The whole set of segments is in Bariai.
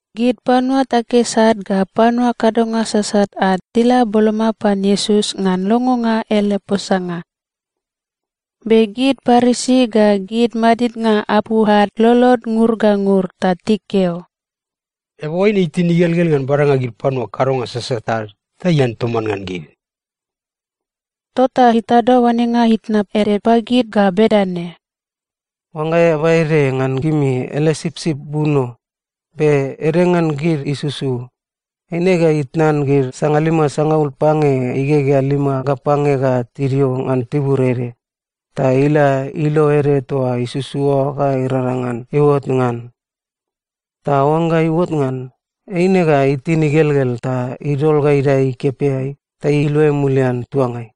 Gid panua takis ad ga panua kadonga sasat ad tila boloma pan Iesus ngan longonga ele posanga. Be gid Parisi ga gid madidnga apu ad lolod ngur ga ngur ta tikeo, “Eaba oaine itin igelgel ngan badanga gid panua kadonga sasat ad ta ian toman ngan gid.” Tota itado oanenga itna ede pagid ga bedane, “Oangga eaba ede ngan gimi ele sipsip buno, be ede ngan gid isusu, eine ga itnan gid sangalima sangaul pange igegea lima ga pange ga tidio ngan tibur ede, ta ila ilo ede toa isusu oa ga irangrang ngan iuot ngan. Ta oangga iuot ngan, eine ga itin igelgel ta idol ga idae ikepeai ta iluai mulian tuangai.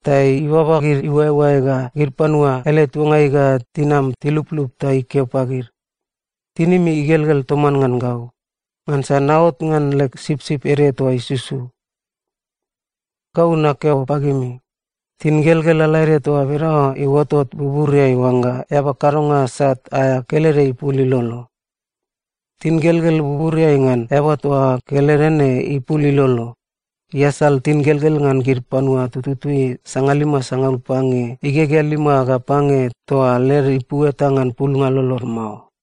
Ta ibaba gid iuaeuae ga gid panua ele tuangai ga tinam tiluplup ta ikeo pagid, ‘Tinimi igelgel toman ngan gau, ngansa naot ngan leg sipsip ede toa isusu!’ Gau nakeo pagimi, tingelgel lalaede toa bedane iuotot buburiai oangga eaba kadonga sat aea kelede ipul ilolo. Tingelgel buburiai ngan eaba toa kelede ne ipul ilolo, iasal tingelgel ngan gid panua tututui sangalima sangaul pange igegea lima ga pange toa led ipu eta ngan pulnga lolod mao.”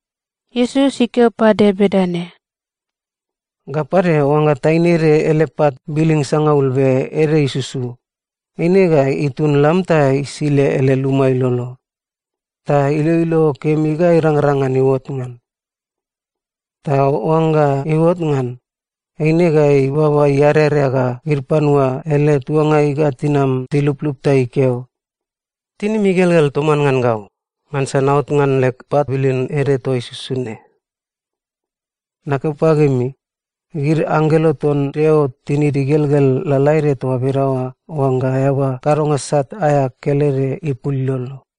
Iesus ikeo pade bedane, “Ga pade, oangga taine ede ele pat biling sangaul be ede isusu, eine ga itun lam ta isile ele luma ilolo, ta iloilo kemi ga irangrang ngan iuot ngan. Ta oangga iuot ngan, eine ga ibaba iarerea ga gid panua ele tuangai ga tinam tiluplup ta ikeo, ‘Tinimi igelgel toman ngan gau, ngansa naot ngan leg pat biling ede toa isusu ne!’ Nakeo pagimi, gid anggelo ton Deo tinid igelgel lalaede toa bedaoa oangga eaba kadonga sat aea kelede ipul ilolo.”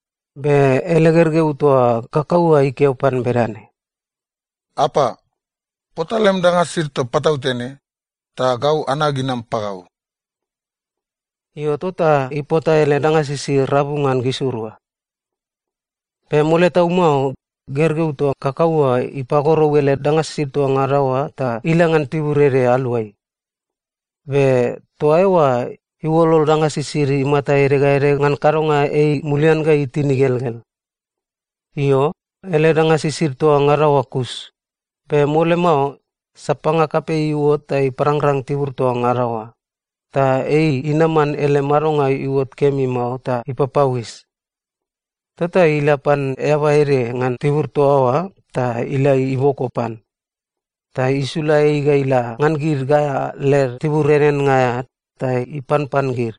Be ele gergeu toa kakau oa ikeo pan bedane, ‘Apa, pota lem danga sisid toa patautene, ta gau anag inam pagau.’ Io, tota ipota ele danga sisid rabu ngan gisirua. “Be mole tau mao, gergeu toa kakau oa ipagorou ele danga sisid toa ngada oa ta ila ngan tibur ede aluai. Be toa eoa iuolol danga sisid imata ede ga ede ngan kadonga ei mulian ga itin igelgel. Io, ele danga sisid toa ngada oa kus, be mole mao sapanga kapei iuot ta iparangrang tibur toa ngada oa, ta ei inaman ele madonga iuot kemi mao ta ipapauis. Tota ila pan eaba ede ngan tibur toa oa ta ila iboko pan, ta isula ei ga ila ngan gid gaea led tibur eaneannga aea ta ipanpan gid.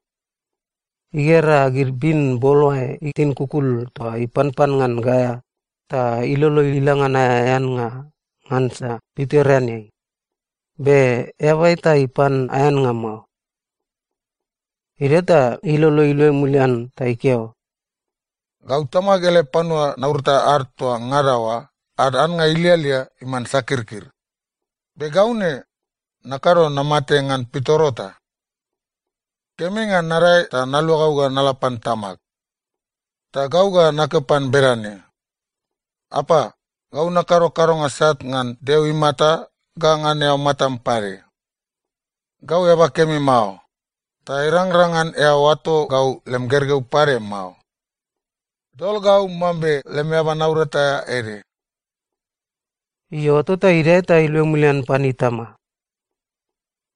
Igera gid bin boloae itin kukul toa ipanpan ngan gaea ta ilolo ila ngan aea eannga ngansa pitoreanei, be eaba eta ipan aea annga mao. “Idio ta ilolo iluai mulian ta ikeo, ‘Gau tamag ele panua naurata ad toa ngada oa ad annga ilialia iman sakirkir, be gau ne, nakado namate ngan pitoro ta. Kemi ngan nadae ta naluagau ga nala pan tamag, ta gau ga nakeo pan bedane, “Apa, gau nakado kadonga sat ngan Deo imata ga ngan eao matam pade. Gau eaba kemi mao, ta irangrang ngan eao oato gau lem gergeu pade mao. Dol gau mambe lem eaba naurata aea ede.” ’ Io, tota idae ta iluai mulian pan itama.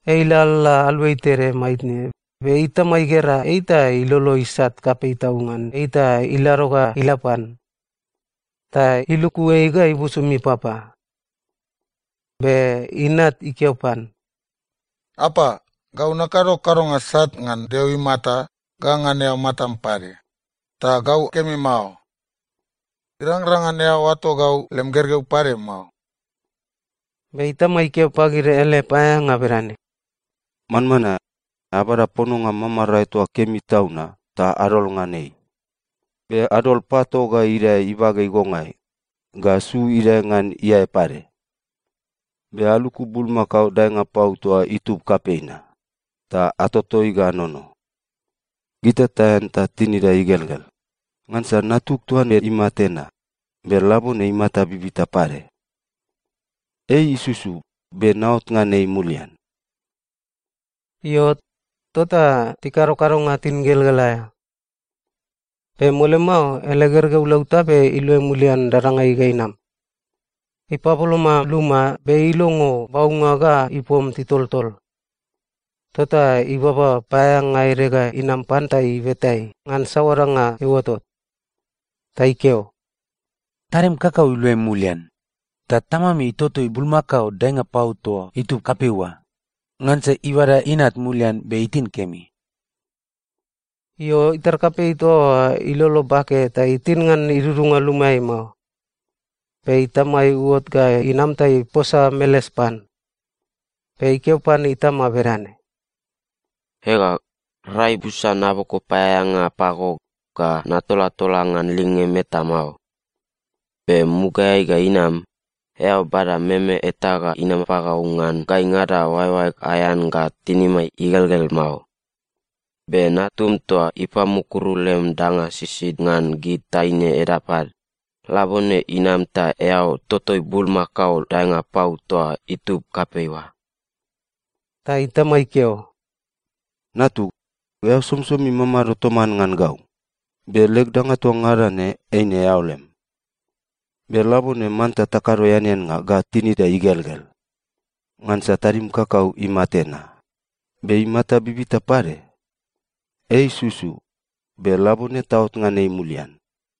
“Ei ilalala aluai tede maitne, be itama igera ei ta ilolo isat kapei tau ngan ei ta ilado ga ila pan. Ta iluku ei ga ibusum ipapa. “Be inat ikeo pan, ‘Apa, gau nakado kadonga sat ngan Deo imata ga ngan eao matam pade, ta gau kemi mao. Irangrang ngan eao oato gau lem gergeu pade mao.’ “Be itama ikeo pagid ele paeaeanga bedane, ‘Manmanae, abada pononga mamarae toa kemi tau na, ta adol ngan ei. Be adol pato ga idae ibage igongai, ga su idae ngan iae pade. Be aluku bulmakao daenga pau toa itub kapei na, ta atotoi ga anono. Gita taean ta tinida igelgel, ngansa natug toa ne imate na, be labone imata bibita pade! Ei isusu, be naot ngan ei mulian!’ Io, tota tikado kadonga tingelgel aea. “Be mole mao, ele gergeu lautabe iluai mulian dadangai ga inam. Ipaboloma luma, be ilongo baunga ga ipom titoltol. Tota ibaba paeaeanga ede ga inam pan ta ibeta ei ngan saoa danga iuotot. Ta ikeo, ‘Tadim kakau iluai mulian, ta tamam itotoi bulmakao daenga pau toa itub kapei oa, ngansa ibada inat mulian be itin kemi.’ “Io, itar kapei toa oa ilolo bake ta itin ngan idudunga lumaeai mao. Be itama iuot ga inam ta iposa meles pan. Be ikeo pan itama bedane, ‘Ega, rai busa naboko paeaeanga pago ga natolatola ngan lingem eta mao, be mugaeai ga inam, eao bada meme eta ga inam pagau ngan gaingada oaeoaeg aean ga tinimai igelgel mao. Be natum toa ipamukuru lem danga sisid ngan gid taine edap ad, labone inam ta eao totoi bulmakao daenga pau toa itub kapei oa.’ “Ta itama ikeo, ‘Natug, eao somisomi mamado toman ngan gau, be leg danga toa ngada ne eine eao lem. Be labone manta takado eaneannga ga tinida igelgel, ngansa tadim kakau imate na, be imata bibita pade! Ei isusu, be labone taot ngan ei mulian!’”